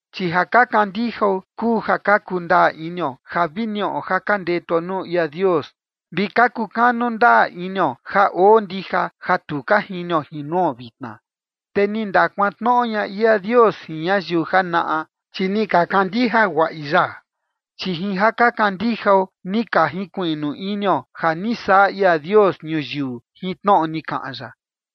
Chi ja ka kandijao kuu ja ka kundaa inio ja vi niꞌo ja ka ndetuo nuu ia Dios vi ka kukanu ndaa inio ja oo ndija ja tu ka jinio jin nuo vitna. Te ni ndakuantnoꞌo ña ia Dios jin ñayiu janaꞌa, chi ni ka kandija guaꞌi ya. Chi jin ja ka kandijao, ni ka jinkuiꞌnu inio ja ni saꞌa ia Dios ñuyiu jin tnoꞌo ni kaꞌan ya.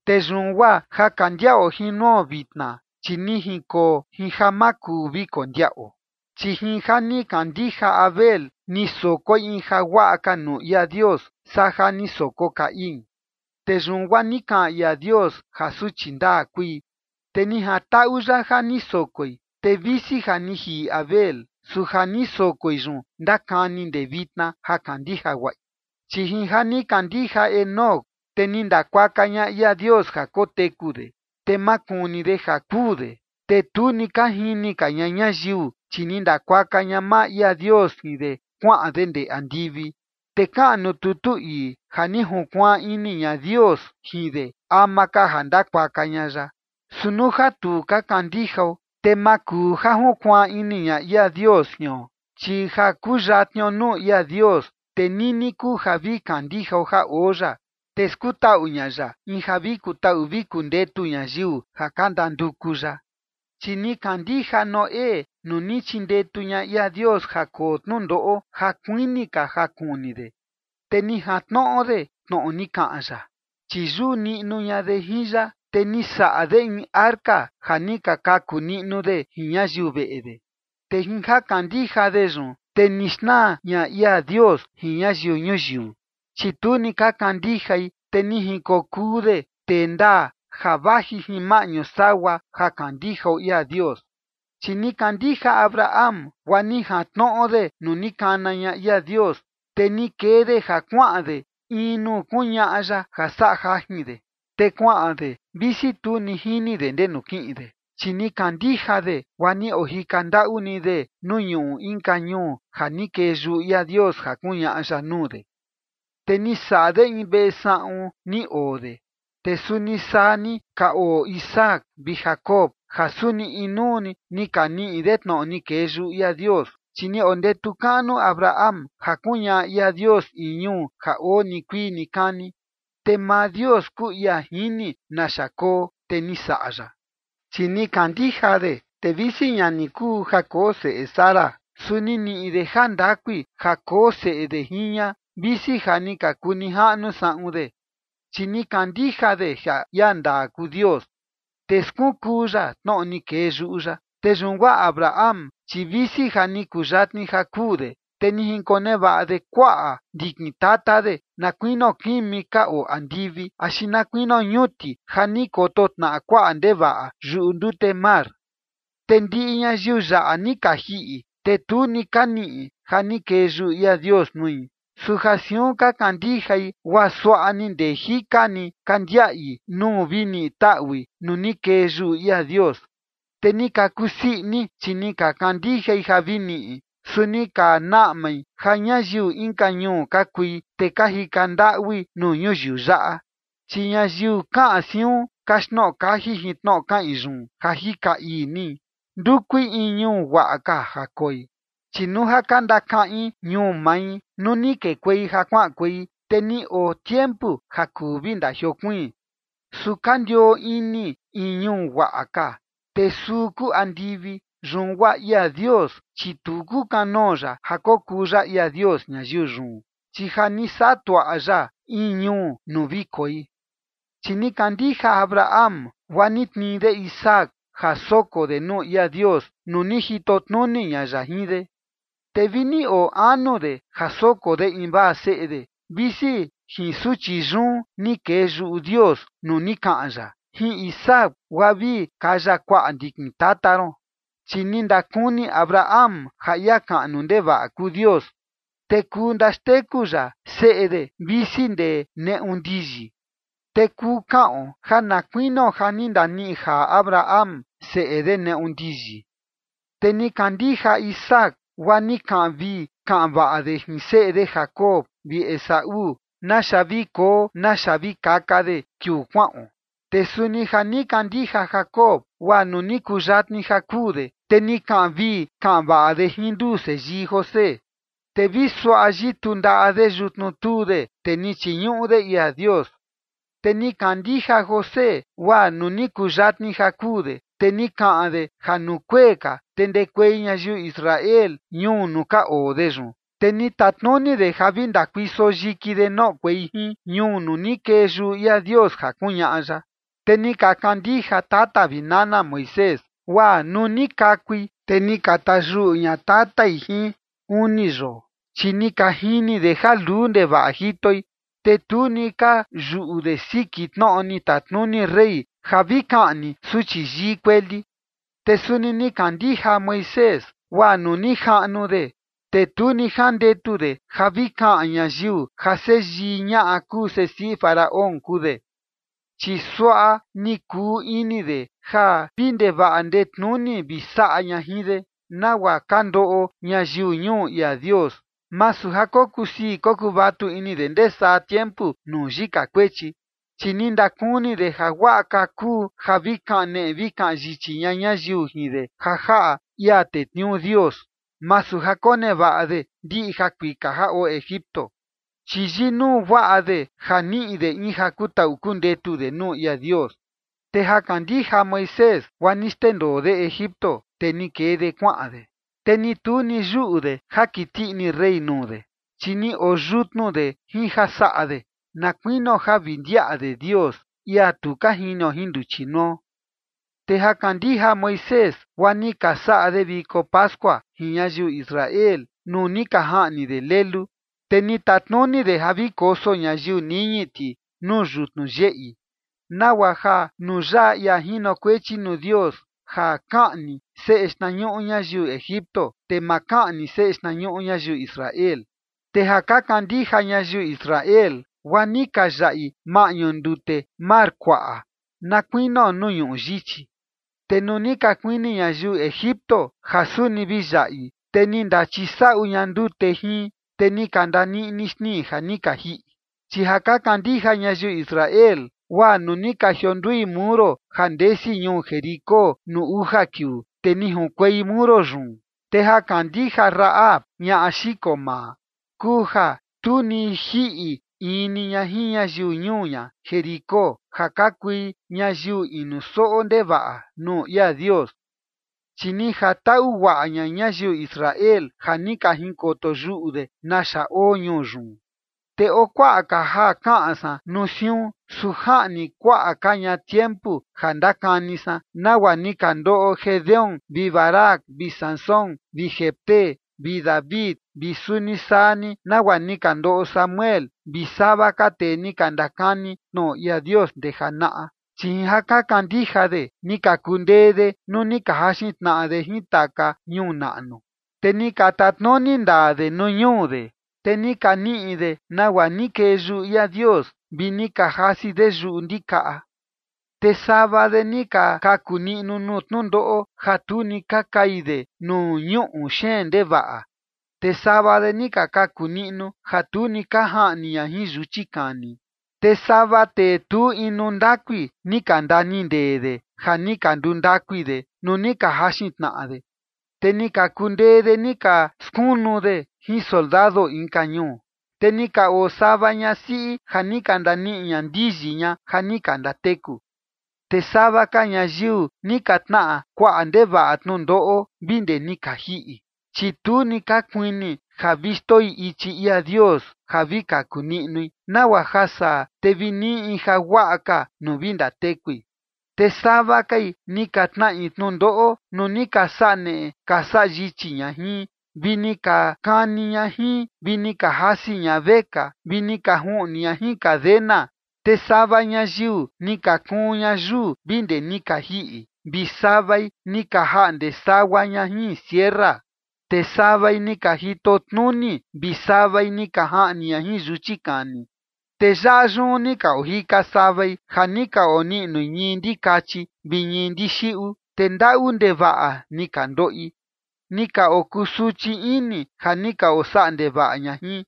Te yun guaa ja ka ndiaꞌo jin nuo vitna, chi ni jinkoo jin ja ma kuu vi kondiaꞌo. Chi jin ja ni kandija Abel ni sokoi in jaguaꞌa ka nuu ia Dios saa ja ni soko Caín. Te yun guaa ni kaꞌan ia Dios ja suchi ndaa kui, te ni jantaꞌu ya ja ni sokoi. Te visi ja ni jiꞌi Abel, su ja ni sokoi yun ndakani ndee vitna ja kandija guaꞌi. Chi jin ja ni kandija Enoc, te ni ndakuaka ña ia Dios ja koteku de. Te ma kuni de ja kuu de, te tu ni ka jini ka ña ñayiu, chi ni ndakuaka ña maa ia Dios jin de kuaꞌan de ndee andivi. Te kaꞌan nuu tutu ii ja ni junkuaan ini ña Dios jin de ama ka ja ndakuaka ña ya. Su nuu ja tu ka kandijao, te ma kuu ja junkuaan ini ña ia Dios jion, chi ja kuyatnio nuu ia Dios, te nini kuu ja vi kandijao ja oo ya, te skutaꞌu ña ya in ja vi kutaꞌu vi kundetu ñayiu ja ka ndanduku ya. Chi ni kandija Noé, nuu ni chindetu ña ia Dios ja koo tnundoꞌo ja kuini ka ja kuni de. Te ni jantnoꞌo de tnoꞌo ni kaꞌan ya, chi yuꞌu niꞌnu ña de jin ya, te ni saꞌa de in arca ja ni ka kaku niꞌnu de jin ñayiu veꞌe de. Te jin ja kandija de yun, te ni xnaa ña ia Dios jin ñayiu ñuyiu, chi tu ni ka kandijai, te ni jinkokuu de tee ndaa ja vaji jin maꞌñu sagua ja kandijao ia Dios. Chi ni kandija Abraham, guaa ni jantnoꞌo de nuu ni kana ña ia Dios, te ni kee de ja kuaꞌan de in nuu kuñaꞌa ya ja saꞌa jajin de. Te kuaꞌan de, visi tu ni jini de ndenu kiꞌin de. Chi ni kandija de, guaa ni ojika ndaꞌu ni de nuu ñuꞌu inka ñuu ja ni kee yuꞌu ia Dios ja kuñaꞌa ya nuu de. Te ni saꞌa de in veꞌe saꞌun ni oo de, te suni saa ni ka oo Isaac vi Jacob, ja suni inuu ni ni ka niꞌi de tnoꞌo ni kee yuꞌu ia Dios. Chi ni ondetu kaꞌnu Abraham ja kuñaꞌa ia Dios in ñuu ja oo nikuii nikani, te maa Dios kuu ia jini naxa koo, te ni saꞌa ya. Chi ni kandija de, te visi ña ni kuu ja koo seꞌe Sara, su ni niꞌi de jandakui, ja koo seꞌe de jin ña, visi ja ni ka kuu nijaꞌnu saꞌun de. Chi ni kandija de ja ia ndaa kuu Dios, te skunkuu ya tnoꞌo ni kee yuꞌu ya. Te yun guaa Abraham, chi visi ja ni kuyatni ja kuu de, te ni jinkonevaꞌa de kuaꞌa ndikin tata de, na kuinio kimi ka oo andivi axi na kuinio ñuti ja ni koto tnaꞌa kuaꞌa ndevaꞌa yuꞌu ndute mar. Te ndiꞌi ñayiu yaꞌa ni ka jiꞌi, te tu ni ka niꞌi ja ni kee yuꞌu ia Dios nui, su ja siun ka kandijai, guaa suaꞌa ni ndee jika ni ka ndiaꞌi nuu vi niꞌi taꞌui nuu ni kee yuꞌu ia Dios. Te ni ka kusii ini, chi ni ka kandijai ja vi niꞌi. Su ni ka naꞌmai ja ñayiu inka ñuu ka kui, te ka jika ndaꞌui nuu ñuyiu yaꞌa. Chi ñayiu kaꞌan siun kaxtnoꞌo kaji jin tnoꞌo kaꞌin yun ja jika ii ni, ndukui in ñuu guaꞌa ka ja koi. Chi nuu ja ka ndakaꞌin ñuu mai nuu ni kekuei ja kuaꞌankuei, te ni oo tiempu ja kuu vi ndajiokuiin. Su ka ndioo ini in ñuu guaꞌa ka, te suu kuu andivi. Yun guaa ia Dios, chi tu kukanoo ya ja kokuu ya ia Dios ñayiu yun, chi ja ni saꞌa tuaꞌa ya in ñuu nuu vi koi. Chi ni kandija Abraham, guaa ni tnii de Isaac ja soko de nuu ia Dios nuu ni jito tnuni ña ya jin de. Te vi ni oo anu de ja soko de invaa seꞌe de, visi jin suchi yun ni kee yuꞌu Dios nuu ni kaꞌan ya: “Jin Isaac guaa vi kaya kuaꞌa ndikin tata ron”. Chi ni ndakuni Abraham ja ia kaꞌnu ndevaꞌa kuu Dios, te kuu ndaxteku ya seꞌe de, visi ndee neꞌu ndiyi. Te kuu kaꞌon ja na kuinio ja ni ndaniꞌi jaa Abraham seꞌe de neꞌu ndiyi. Te ni kandija Isaac guaa ni kaꞌan vii kaꞌan vaꞌa de jin seꞌe de Jacob vi Esaú naxa vi koo naxa vi kaka de kiuu kuaꞌon. Te suni ja ni kandija Jacob, guaa nuu ni kuyatni ja kuu de, te ni kaꞌan vii kaꞌan vaꞌa de jin nduu seyii José. Te vi suaꞌa yituu ndaꞌa de yutnu tuu de, te ni chiñuꞌu de ia Dios. Te ni kandija José, guaa nuu ni kuyatni ja kuu de, te ni kaꞌan de ja nuu kuee ka, te ndekuei ñayiu Israel ñuu nuu ka oo de yun, te ni tatnuni de ja vi ndakuiso yiki de noꞌokuei jin ñuu nuu ni kee yuꞌu ia Dios ja kuñaꞌa ya. Te ni ka kandija tata vi nana Moisés, guaa nuu ni kakui, te ni ka tayuꞌu ña tatai jin uni yoo, chi ni ka jini de ja luu ndevaꞌa jitoi, te tu ni ka yuꞌu de siki tnoꞌo ni tatnuni rey ja vi kaꞌni suchi yii kueli. Te suni ni kandija Moisés, guaa nuu ni jaꞌnu de, te tu ni jandetu de ja vi kaꞌan ñayiu ja seyii ñaꞌa kuu sesiꞌi Faraón kuu de. Chi suaꞌa ni kuu ini de ja vi ndevaꞌa ndetnuni vi saꞌa ña jin de, nagua ka ndoꞌo ñayiu ñuu ia Dios, masu ja kokusii kokuvatu ini de ndee saa tiempu nuu yika kuechi. Chi ni ndakuni de ja guaꞌa ka kuu ja vi kaneꞌe vi kaꞌan yichi ña ñayiu jin de ja jaꞌa ia tetniuu Dios, masu ja konevaꞌa de ndiꞌi jakuika ja oo Egipto. Chi yinuu guaꞌa de ja niꞌi de in ja kutaꞌu kundetu de nuu ia Dios. Te ja kandija Moisés, guaa ni xndendoo de Egipto, te ni kee de kuaꞌan de. Te ni tu ni yuꞌu de ja kiti ini rey nuu de, chi ni oo yutnu de jin ja saꞌa de, na kuinio ja vi ndiaꞌa de Dios, ia tu ka jinio jin nduchi nuo. Te ja kandija Moisés, guaa ni ka saꞌa de viko pascua jin ñayiu Israel, nuu ni ka jaꞌni de lelu. Te ni tatnuni de ja vi koso ñayiu niñi ti nuu yutnu yeꞌi, nagua ja nuu yaꞌa ia jinokuechi nuu Dios ja kaꞌni seꞌe xtnañuꞌu ñayiu Egipto, te ma kaꞌni seꞌe xtnañuꞌu ñayiu Israel. Te ja ka kandija ñayiu Israel, guaa ni ka yaꞌi maꞌñu ndute mar kuaꞌa, na kuinio nuu ñuꞌu yichi. Te nuu ni ka kuini ñayiu Egipto ja suni vi yaꞌi, te ni ndachisaꞌu ña ndute jin, te ni ka ndaniꞌni xnii ja ni ka jiꞌi. Chi ja ka kandija ñayiu Israel, guaa nuu ni ka jiondui muro ja ndesi ñuu Jericó nuu uja kiuu, te ni junkuei muro yun. Te ja kandija Rahab, ñaꞌa xiko maa, kuu ja tu ni jiꞌi in ni ña jin ñayiu ñuu ña Jericó, ja ka kui ñayiu inuu soꞌo ndevaꞌa nuu ia Dios. Chi ni jantaꞌu guaꞌa ña ñayiu Israel ja ni ka jinkoto yuꞌu de naxa oo ñuu yun. Te oo kuaꞌa ka ja kaꞌan san nuu siun, su jaꞌni kuaꞌa ka ña tiempu ja ndakani san nagua ni ka ndoꞌo Gedeón vi Barac vi Sansón vi Jefté vi David vi suni saa ni nagua ni ka ndoꞌo Samuel vi sava ka tee ni ka ndakani tnoꞌo ia Dios ndee janaꞌa. Chi jin ja ka kandija de ni ka kundee de nuu ni ka jaxin tnaꞌa de jin taka ñuu naꞌnu, te ni ka tatnuni ndaa de nuu ñuu de, te ni ka niꞌi de nagua ni kee yuꞌu ia Dios, vi ni ka jasi de yuꞌu ndikaꞌa. Te sava de ni ka kaku niꞌnu nuu tnundoꞌo ja tu ni ka kai de nuu ñuꞌu xeen ndevaꞌa. Te sava de ni ka kaku niꞌnu ja tu ni ka jaꞌni ña jin yuchi kani. Te sava tee tu inu ndakui, ni ka ndanindee de, ja ni ka nduu ndakui de nuu ni ka jaxin tnaꞌa de, te ni ka kundee de ni ka skunu de jin soldado inka ñuu. Te ni ka oo sava ñasiꞌi ja ni ka ndaniꞌi ña ndiyi ña ja ni ka ndateku. Te sava ka ñayiu ni ka tnaꞌa kuaꞌa ndevaꞌa tnundoꞌo vi ndee ni ka jiꞌi, chi tu ni ka kuini ja vi xndoi ichi ia Dios ja vi kaku niꞌnui, nagua ja saa, te vi niꞌi in jaguaꞌa ka nuu vi ndatekui. Te sava kai ni ka tnaꞌi tnundoꞌo nuu ni ka saꞌa neꞌe ka saꞌa yichi ña jin, vi ni ka kani ña jin, vi ni ka jasi ña vekaa vi ni ka juꞌni ña jin cadena. Te sava ñayiu ni ka kuun ña yuu vi ndee ni ka jiꞌi, vi savai ni ka jaꞌnde sagua ña jin sierra. Te savai ni ka jito tnuni, vi savai ni ka jaꞌni ña jin yuchi kani. Te yaꞌa yun ni ni ka ojika savai ja ni ka oniꞌnui ñii ndikachi vi ñii ndixiꞌu, te ndaꞌu ndevaꞌa ni ka ndoꞌi, ni ka okusuchi ini ja ni ka osaꞌa ndevaꞌa ña jin.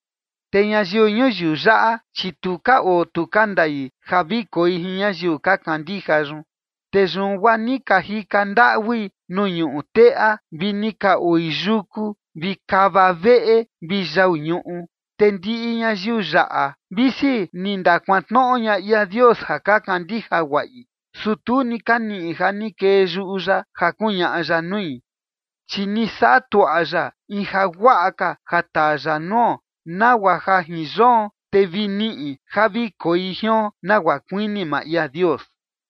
Te ñayiu ñuyiu yaꞌa, chi tu ka oo tu ka ndai ja vi koi jin ñayiu ka kandija yun. Te yun guaa ni ka jika ndaꞌui nuu ñuꞌu teꞌa, vi ni ka oi yuku vi kava veꞌe vi yau ñuꞌu. Te ndiꞌi ñayiu yaꞌa, visi ni ndakuantnoꞌo ña ia Dios ja ka kandija guaꞌi, su tu ni ka niꞌi ja ni kee yuꞌu ya ja kuñaꞌa ya nui. Chi ni saꞌa tuaꞌa ya in jaguaꞌa ka ja taa ya nuo, nagua ja jin yoon, te vi niꞌi ja vi koi jion nagua kuini maa ia Dios.